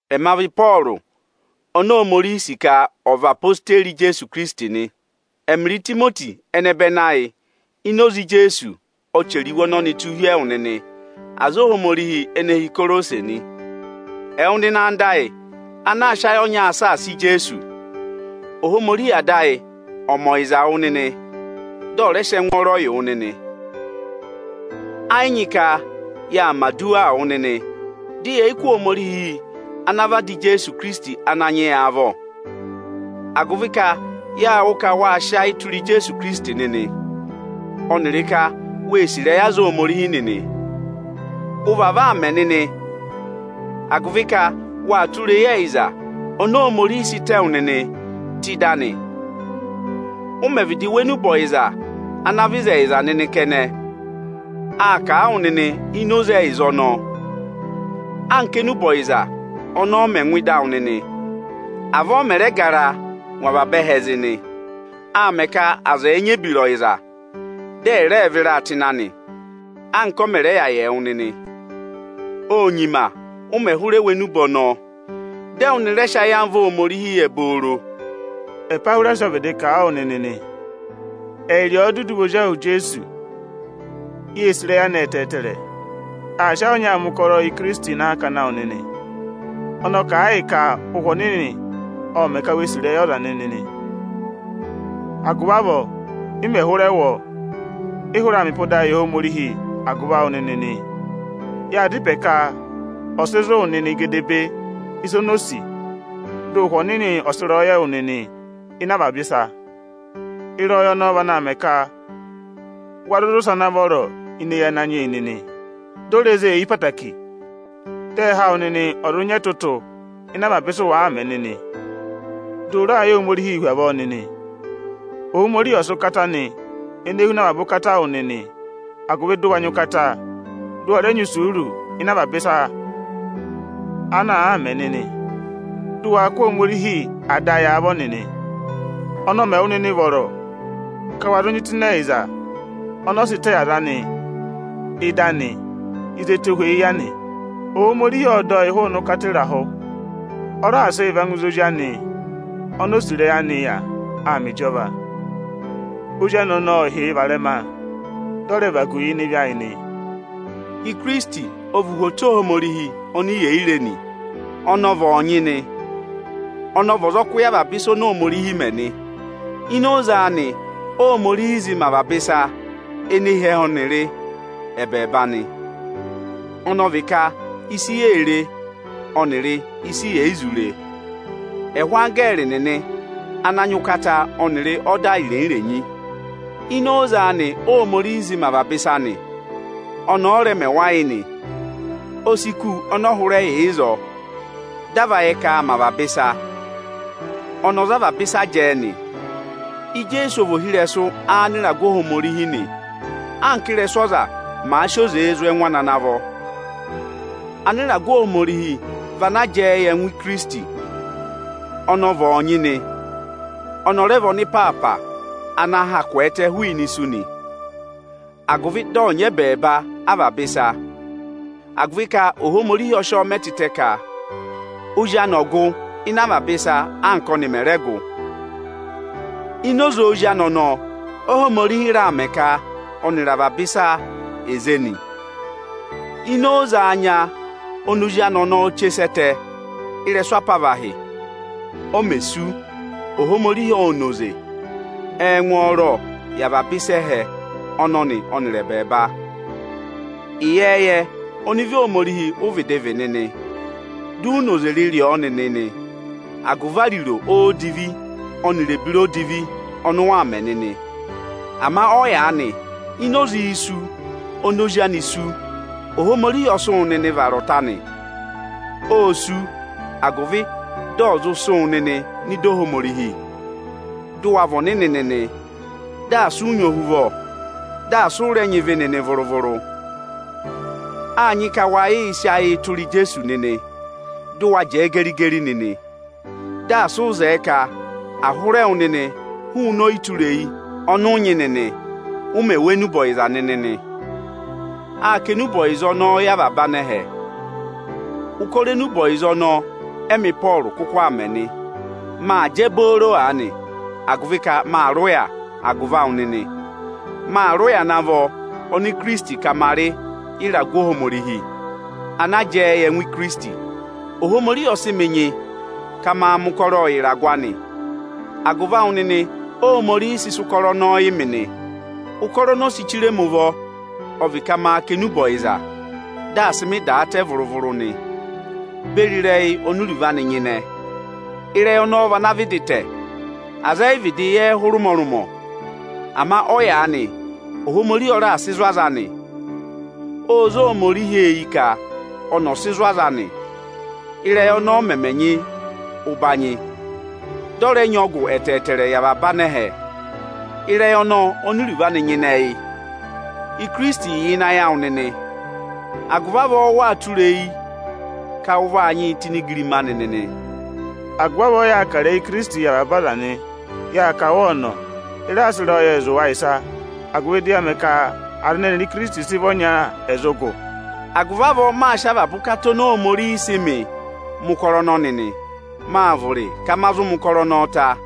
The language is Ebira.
Ẹma vị Ịpọọrụ oni Ohomorihi sì ka ọ̀ vị odeyi Ijeesu Ikirisiti nị. Ẹmịrị Itimoti ọnẹbẹnị ayị ini oze Ijeesu ọ chẹrẹ iwe ọnọnị tụ́ hi ẹwụ nịnị, aza Ohomorihi ene hi Ikorosi nị. Ẹwụ nịnị anda ayị ana aa sị ayị ọnyaa saasa Ijeesu. Ohomorihi ọ̀ mẹ ọyịza wụ nịnị, dị ọ̀ rẹ sị ẹngwọọrọ yị wụ nịnị. Ẹ yị nyị ka yaa mẹ̀ aduwaa wụ nịnị, dị yẹ̀ yị kụ́ Ohomorihi ana vị Ada Ijeesu Ikirisiti Ananyị yị avọ; agụvị ka yâ wụ́ ka waa sị ayị tụra Ijeesu Ikirisiti nịnị, ọnịrị ka wee sì ịrẹyị aza Ohomorihi nịnị. Ụ vavọọ aa mẹ nịnị agụvị ka waa tụra eyi ẹyịza oni Ohomorihi sị tẹ wụ nịnị tụ́ ịdị anị. Ụ mẹ̀ vịdị wụ́ enube ọyịza ana vị ịzẹyịza nịnị kẹnẹ, â kà a wụ nịnị ini oze ẹyịza ọnọọ nị. Anka énube ọyịza ọnọọ mẹ̀ ngụ ịdị awụ nịnị, avọọ ọ mẹ̀ raa garaa ngụ avaba ẹhẹẹ zị nị. Aa mẹ ka aza ẹ̀ẹ nyị ebira ọyịza, dị ẹ̀ rẹẹ vịraa tụ́ ịnị anị, anka ọ mẹ̀ rẹ yà yị ẹwụ nịnị. Ô nyima ụ mẹ̀ hụrẹ wụ́ enube ọnọọ, dị ẹwụ nịnị rẹ sị ayamva Ohomorihi yẹ obooro. Epahwirasi ọ vịdị kà a wụ nịnị nị. Ẹyịrị ọ dudu vị ezi ahụ Ijeesu. Yée sì ịrẹyị anị ẹtẹẹtẹrẹ. Aa sị ayị ọnyaa mẹ ụkọrọọ yị Ikirisiti ịnị akakana awụ nịnị. Ọnị ọ kà a yị ka Ụhwẹ Ọnịnị ộ mẹ̀ ka we sì ịrẹyị ọza nịnị nị. Agụvị avọọ, ị mẹ̀ hụrẹ wụ́ ọ, ị hụrẹ aa mẹ ịpọdaa yị Ohomorihi agụvị awụ nịnị nị. Yaa dá ịpẹ ka ọ̀ sị zụ̀ wụ nịnị gedebee ịsa oni o sì, dị Ụhwẹ Ọnịnị ọ̀ sị ịrẹyọyẹ yị wụ nịnị ịnị avaba ịsa. Ịrẹyọyẹ ọnọọ vaa mẹ ka wa zụụ zị ụsẹ ana vọrọ ini eyi Ananyị yị nịnị, di o re zé eyi ẹtẹẹtẹrẹ; dị ẹhẹ awụ nịnị ọ̀ zụ nyị ẹtụtụ ịnị avaba ịsị ụ wàaa mẹ nịnị. Dị ụ raa yẹ Ohomorihii hu avọọ nịnị. Ohomorihi ọ̀ sị ụkata anị, ene huna avaba ụkata yị wụ nịnị, agụvị dị ụ wa nyị ụkata, dị ụ wa rẹ nyị isuuru ini avaba ịsa ana àaa mẹ nịnị; dị ụ waa kụ́ Ohomorihi Ada ayị avọ nịnị. Ọnị ọ mẹ wụ nịnị vọrọ ka wa zụ nyị tụ́ ịnị ẹyịza ọnị ọ sị tẹ yị aza anị ịdị anị ịzị ẹtohweyi ya nị. Ohomorihi ộ dọ yị hụụnị ụkata ịrahụ, ọ raà sị yị va ngụ ịzị Ozi anị oni o sì ịrẹyị anị yà aa mẹ ịjọva. Ozi anị ọnọọ ọ hị́ yị varẹma, dị ọ rẹ vagu yị ịnị ịvị ayị nị. Ikirisiti ọ vị uhwoto Ohomorihi oni yè yi re nị. Ọnị ọ vị ọọnyị nị, ọnị ọ vị ọzọkụ yị avaba ịsa oni Ohomorihi mẹ nị Ini oze anị Óhomorihi zị mẹ avaba ịsa ene hi ẹhẹ ọnịrị ẹbẹẹba nị, ọnị ọ vị ka ịsị yee re ọnịrị ịsị yè yi zụ re, ẹhụụ anggẹẹrị nịnị ana nyị ụkata ọnịrị ọda irenyi-irenyi. Ini oze anị Óhomorihi zị mẹ avaba ịsa nị. Ọnị ọ rẹ mẹ wa yị nị. O si kù ọnị ọ hụrẹ yà ịzọọ, dị a va yẹ ka aa mẹ avaba ịsa. Ọnị ọ za avaba ịsa jẹẹ nị Ijeesu ọ vị ohirẹsụ anịragụ Ohomorihi anka ị́rẹsụ ọza maà sị oze zụ̀ ẹngụ ana vọ. Anịragụ Ohomorihi vị ana jẹẹ yị ẹngụ Ikirisiti. Ọnị ọ vị ọọnyị nị. Ọnị ọ vị ọnịpaapa ana ha kwẹẹtẹ hụụnị isu agụvị dị ọ̀ nyị ẹbẹẹba avaba ịsa nị. Agụvị ka Ohomorihi ọ sị ọ mẹ tịtẹ ka Ozi anị ọ̀ gụ ịnị avaba ịsa, anka ọnị mẹ̀ rẹ gụ Ini oze Ozi anị ọnọọ, Óhomorihi raà mẹ ka ọnịrị avaba ịsa è zé nị. Ini oze anya oni Ozi anị ọnọọ che sẹ ẹtẹ ịrẹsụ apavahị o mè sú, Ohomorihi ô na oze ẹngwọọrọ yị avaba aza ẹhẹ ọnọnị ọnịrị ẹbẹẹba. Ịyẹẹyẹ ọnịvị Ohomorihi ụ vịdị vị nịnị, di u noze rịrị ọ nịnị agụvị ariro odivi ọnịrị ebira odivi ọnị ụ waa mẹ nịnị nị. Ama ọyaanị, ini oze isu oni Ozi anị sú, Ohomorihi ọ sị wụ nịnị vara ọta anị. Ô sú, agụvị ọ̀ zụ sị wụ nịnị nọ ịdị Ohomorihi, dị ụ wa vị ọnịnị nịnị, dị asị ụ nyị ohuvọ, dị asị ụ rẹ nyị ịvị nịnị vụrụ-vụrụ. Áa nyị ka wa yịị sị ayịị tụra Ijeesu nịnị, dị ụ wa jẹẹ geri-geri nịnị, dị asị ụ zẹẹ ka à hụrẹ wụ nịnị hụụnị ọyịtureyi ọnị ụ nyị nịnị, ụ mẹ̀ wụ́ enube ọyịza nịnị. Â kà enube ọyịza ọnọọ yị avaba anẹhẹ. Ụkọrọ enube ọyịza ọnọọ ẹmị Ịpọọrụ kụkụ aa mẹ nị. Maa jẹ booro aanị, agụvị ka maa rị ụya agụvị awụ nịnị. Maa rị ụya ana vọ ọnị Ikirisiti ka ma rị yị ịragụ Ohomorihi, ana jẹẹ yị ẹngụ Ikirisiti. Ohomorihi ộ sị mị nyị ka maa mẹ̀ ụkọrọọ yị ịragụ anị. Agụvị awụ nịnị Óhomorihi sị sị ụkọrọ ọnọọ yị mị nị. Ụkọrọ oni o si chire mi ụvọ ọ vị ka maa kà enube ọyịza, dị asị mị da a tẹ vụrụ-vụrụ, beri ịrẹyị oni iruvo anị nyịnẹ. Ịrẹyị ọnọọ vị ana vị dị tẹ̀; aza ẹ yị vịdị yẹẹ hụrị ụmọrụmọ. Ama ọyaanị Ohomorihi ọ raà sị zụ̀ aza anị. Ô zé Ohomorihi eyi ka ọ̀ sị zụ̀ aza anị ị́rẹyị ọnọọ mẹmẹ nyị ụbanyị, dị ọ rẹ nyị ọgụ yị avaba anẹhẹ. Ịrẹyị ọnọọ oni iruvo anị nyịnẹ yị Ikirisiti yà ịnị ayị awụ nịnị, agụvị avọọ waa tụra eyi ka ụ vaa nyị tụ́ ini igirima anị nịnị. Agụvị avọọ ị yaa kà ịrẹyị Ikirisitii yị avaba aza nị. Yaa kà wa ọnọ, ị raa sị ịrẹyọyẹẹ zụ̀ wa ịsa, agụvị dị ya mẹ ka aza ẹnẹ ẹnịrị Ikirisiti sị vị ọnya ẹ̀ zụ gụ. Agụvị avọọ m maa sị avaba ụkata oni Ohomorihi sị mịị mẹ̀ ụkọrọ ọnọnị nị. Maa vụrị ka ma zụ mẹ̀ ụkọrọ ọnọọ ta.